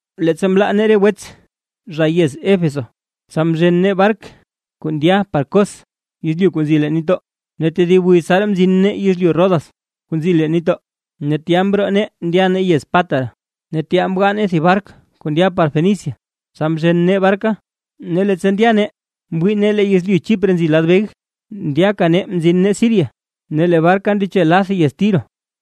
Leettsa mlaa nee re wets zha yez Éfeso, tsa mzhen nee bark kuu ndya par Cos yezlyu kuu nzi leen nitdoo. Ne tedib wiz tsaraa mzin nee yezlyu Rodas kuu nzi leen nitdoo, ne tya mroo nee ndya nee yez Pátara. Ne tya mgaa nee thib bark kuu ndya par Fenicia, tsa mzhen nee barka. Ne leettsa ndya nee mwii nee lee yezlyu Chipre nzi lad beg. Ndyaka nee mzin nee Siria ne lee barka ndeche lath yez Tiro,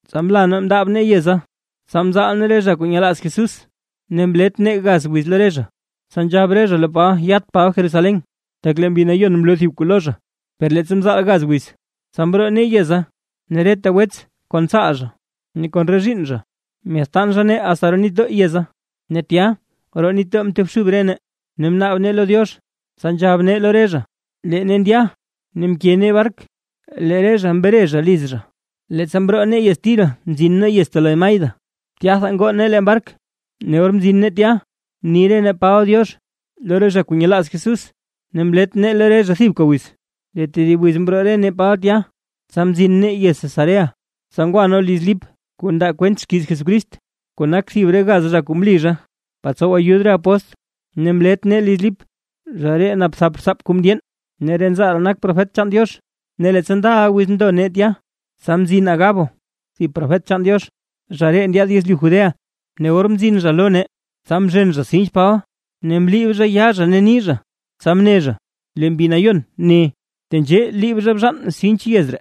tsa mla nee mndaab nee yeza. Tsa mzaal nee re zha kuu nyelaaz Jesús, ne mlet nee gaz wiz lo re zha, tsa nzhab re zha lo Paba yat Paba Jerusalén, tak lee Mbi Nayon mloo thib kuu lo zha. Per leettsa mzaal gaz wiza, tsa mroo nee yeza ne reta wets kon tsaal zha ne kon re zhiinn zha, myaadtaan zha nee asta roo nitdoo yeza. Ne tya roo nitdoo mtobxub re nee ne mnaab nee lo Diox. Tsa nzhab nee lo re zha, lee nee ndya ne mke nee bark lee re zha mretab zha liz zha. Leettsa mroo nee yez Tiro mzin nee yez Tolemaida tyatha ngoo nee bark, ne or mzin nee tya mni re nee Paba “diox” lo re zha kuu nyelaaz Jesús, ne mlet nee lo re zha thibka wiz. Lee tedib wiz mroo re nee Paba tya, tsa mzin nee yez Cesarea. Tsa ngwa nee liz Lip kuu ndaa kwent xkiiz Jesucrist, kuu nak thib re gaz zha kuu mli zha par tsow ayud re apóstl, ne mlet nee liz Lip. Zha ree nap thap rtsaap kuu mndyeen, ne re nzaa ree nak profet chaan Diox. Ne leettsa ndaʼa wiz ndo nee tya, tsa mzin Agabo thib profet chaan Diox, zha ree ndyaad yezlyu Judea. Ne or mzin zha lo nee, tsa mzhen zha sinch Paba ne mliib zhay yaa zha ne ni zha, tsa mne zha: ―Lee Mbi Nayon ne, tenzhee liib zha bzhaan sinch ree yez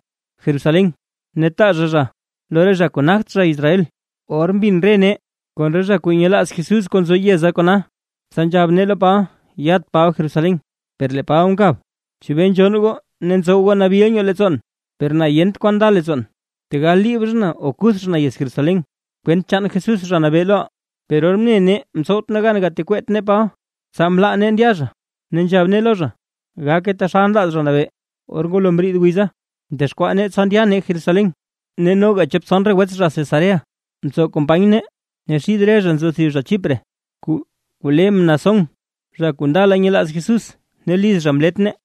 Jerusalén, ne taa zha zha lo re zha kuu nagt zha Israel. Or mbin re nee kon re zha kuu nyelaaz Jesús kuu nzo yeza kona, tsa nzhab nee lo Paba yat Paba Jerusalén. Per lee Paba mkab: ―¿Chebee nzhonn goo ne ntsow goo nabil nyoo leettsoon? Per na yent kwan nda leettsoon, tegal liib zha na o kuth zha na yez Jerusalén, kwent chaan Jesús Zha Nabee lo reʼaa. Per or mne nee mtsowt nee gan gatekweet nee Paba, tsa mlaa nee ndya zha, ne nzhab nee lo zha: ―¡Gake taxal nlaaz Zha Nabee! Or ngwalo mriid wiza mdexkwaa nee tsa ndya nee Jerusalén. Ne noga chop tson re wets zha Cesarea mtsow company nee, ne xid re zha nzo thib zha Chipre kuu le Mnasón, zha kuu ndala nyelaaz Jesús ne liz zha mlet nee.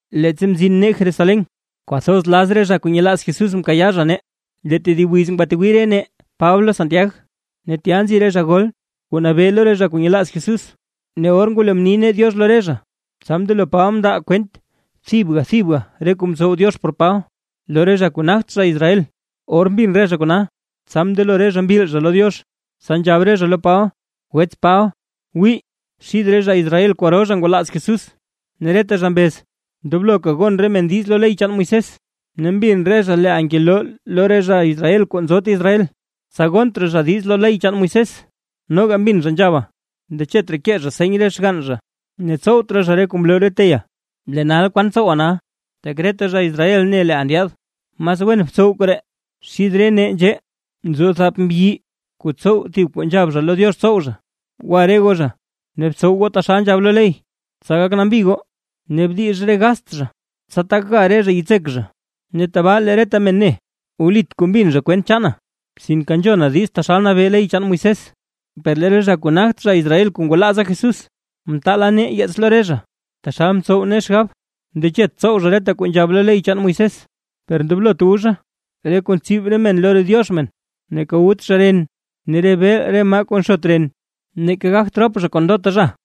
Leettsa mzin nee Jerusalén, kwathoz laz re zha kuu nyelaaz Jesús mkayaa zha nee. Lee tedib wiz ngwatwii re nee Paba lo Santiag ne tya nzi re zha gol kuu nabee lo re zha kuu nyelaaz Jesús. Or ngwalo mni nee “diox” lo re zha, tsa mndelo Paba mndaa kwent thibga thibga re kuu mtsow Diox por Paba lo re zha kuu nagt zha Israel. Or mbin re zha kona, tsa mndelo re zha mbil zha lo Diox. Tsa nzhab re zha lo Paba: ―Wets Paba, wii xid re zha Israel kwaro zha ngwalaaza Jesús ne reta zha mbez ndobloka gon re men diiz lo ley chaan Moisés. Ne mbin re zha leeʼa ngeloo lo re zha Israel kuu nzot Israel, tsa gont raa zha diiz lo ley chaan Moisés, noga mbin zha nzhaba ndechet raa kee zha seny re xgann zha, ne tsowt raa zha re kuu mloo re teyaa. Lee nal, ¿kwan tsowaa nal? Tak reta zha Israel ne leeʼa ndyaad. Mas wen btsow koree: Xith re nee nzhee nzo thap mbyi kuu tsow thib kuu nzhab zha lo Diox tsow zha. Gwa re goo zha ne btsow goo taxal nzhab lo ley, tsa gak nambi goo, ne bdix re gast zha, tsa tak ga re zha yitsek zha. Ne tabaa lee reta men ne, wlit kuu mbin zha kwent chaana, sinke nzhona diiz taxal nabee ley chaan Moisés. Per lee re zha kuu nagt zha Israel kuu ngwalaaza Jesús, mtaala nee yeets lo re zha taxal mtsow nee xgab: Ndechet tsow zha reta kuu nzhab lo ley chaan Moisés. Per ndoblot wu zha re kuu ntsib re men lo diox re men, neeka wut zha ren ne re beel re maa kuu nxot ren, neeka gagt rop zha zha kon ndota zha.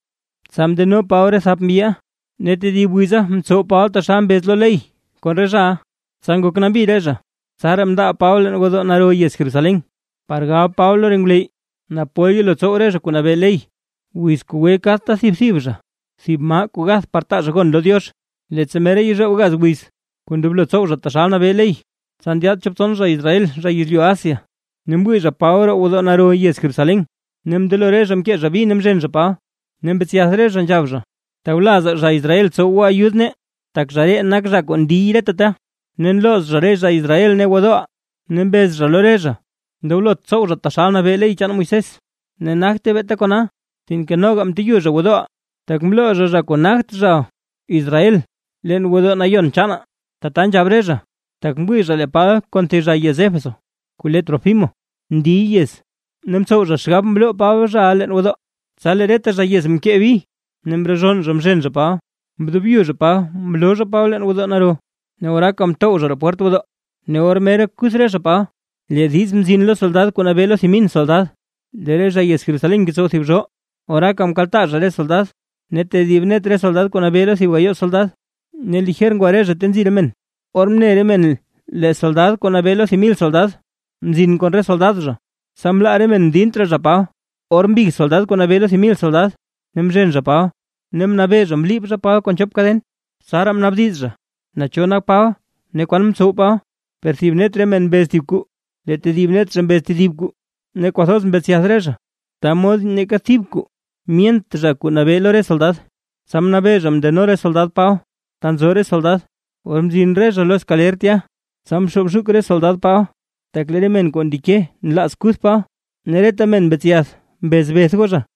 Tsa mndeno Paba re thap mbyiʼa, ne tedib wiza mtsow Paba taxal mbez lo ley kon re zhaʼa, tsa ngok nambi re zha. Tsaraa mndaab Paba leen gwodoo naro yez Jerusalén, par gab Paba lo ngwleyy, naa pol yelo tsow re zha kuu nabee ley, wiz kuu gwe kadta thib thib zha, thib maa kuu gath par taa zha gon lo Diox. Leettsa mera yezhoob gaz wiz kuu ndoblo tsow zha taxal nabee ley, tsa ndyaad chop tson zha Israel zha yezlyu Asia, ne mwii zha Paba roo gwodoo naro yez Jerusalén, ne mndelo re zha mkee zha bi ne mzhen zha Paba, ne mbetsyath re zha nzhab zha: ―¡Tawlazaa zha Israel tsow goo ayud nee! Tak zha ree nak zha kuu ndiy reta ta ne nlooz zha re zha Israel ne gwodooʼaa, ne mbez zha lo re zha ndoblot tsow zha taxal nabee ley chaan Moisés. Ne nagte beeta kona, sinke noga mteyu zha gwodooʼaa, tak mloo zha, zha kuu nagt zha Israel leen gwodoo nayon chaanaa. Tata nzhab re zha, tak mwii zha lee Paba kon thib zha yez Éfeso kuu le Trófimo ndiy yez, ne mtsow zha xgab mloo Paba zhaʼa leen gwodoo. Tsa lee reta zha yez mkee bi ne mrezhonn re zha mzhen zha Paba, mdobyu zha Paba mloo zha Paba leen gwodoo naro, ne oraaka mtow zha roo pwert gwodoo. Ne or mera kuth re zha Paba, lee diiz mzin lo soldad kuu nabee lo thib mil soldad, lee re zha yez Jerusalén ngetsow thib zhoo. Oraaka mkaltaa zha re soldad, ne tedib net re soldad kuu nabee lo thib gayoo soldad, ne lijer ngwa re zha ta nzi re men. Or mne re men lee soldad kuu nabee lo thib mil soldad mzin kon re soldad zha, tsa mlaa re men mdint raa zha Paba. Ora mbig soldad kuu nabee lo thib mil soldad ne mzhen zha Paba, ne mnabee zha mliib zha Paba kon chop kaden; tsaraa mnaabdiz, naa cho nak Paba ne kwan mtsow Paba. Per thib net re men mbez thib kwaa lee tedib net zha mbez tedib kwaa, ne kwathoz mbetsyath re zha, ta mod neeka thib kuu myent zha kuu nabee lo re soldad. Tsa mnabee zha mndeno re soldad Paba ta nzo re soldad. Or mzin re zha lo skaler tya, tsa mxoob zhuk re soldad Paba, tak lee re men kuu ndeke nlaaz kuth Paba. Ne reta men mbetsyath mbez beth goo zha.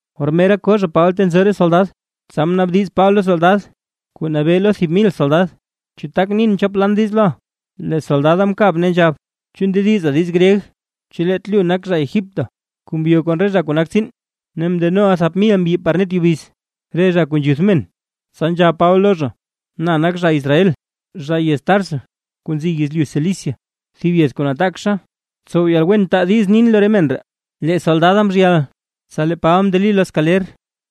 Or mera ko zha Paba ta nzo re soldad, tsa mnaabdiz Paba lo soldad kuu nabee lo thib mil soldad: ―¿Chu tak nin chop lan diiz loʼa? Lee soldada mkab nzhab: ―¿Chu ndediza diiz gryeg? ¿Chu leet lu nak zha Egipto, kuu mbyo kon re zha kuu nak tsiin, ne mndenoʼa thap mil mbyi par net yubiz, re zha kuu nzhuth men? Tsa nzhab Paba lo zha: ―Na nak zha Israel, zha yez Tarso kuu nzi yezlyu Cilicia, thib yez kuu nataakxa; tsow yalwen taa diiz nin lo re men ree. Lee soldada mzhyal. Tsa lee Paba mndeli lo skaler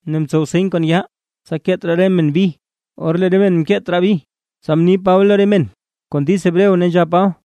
ne mtsow seny kon yaa, tsa keet raa re men bi. Or lee re men mkeet raa bi, tsa mni Paba lo re men kon diiz Hebreo, ne nzhab Paba: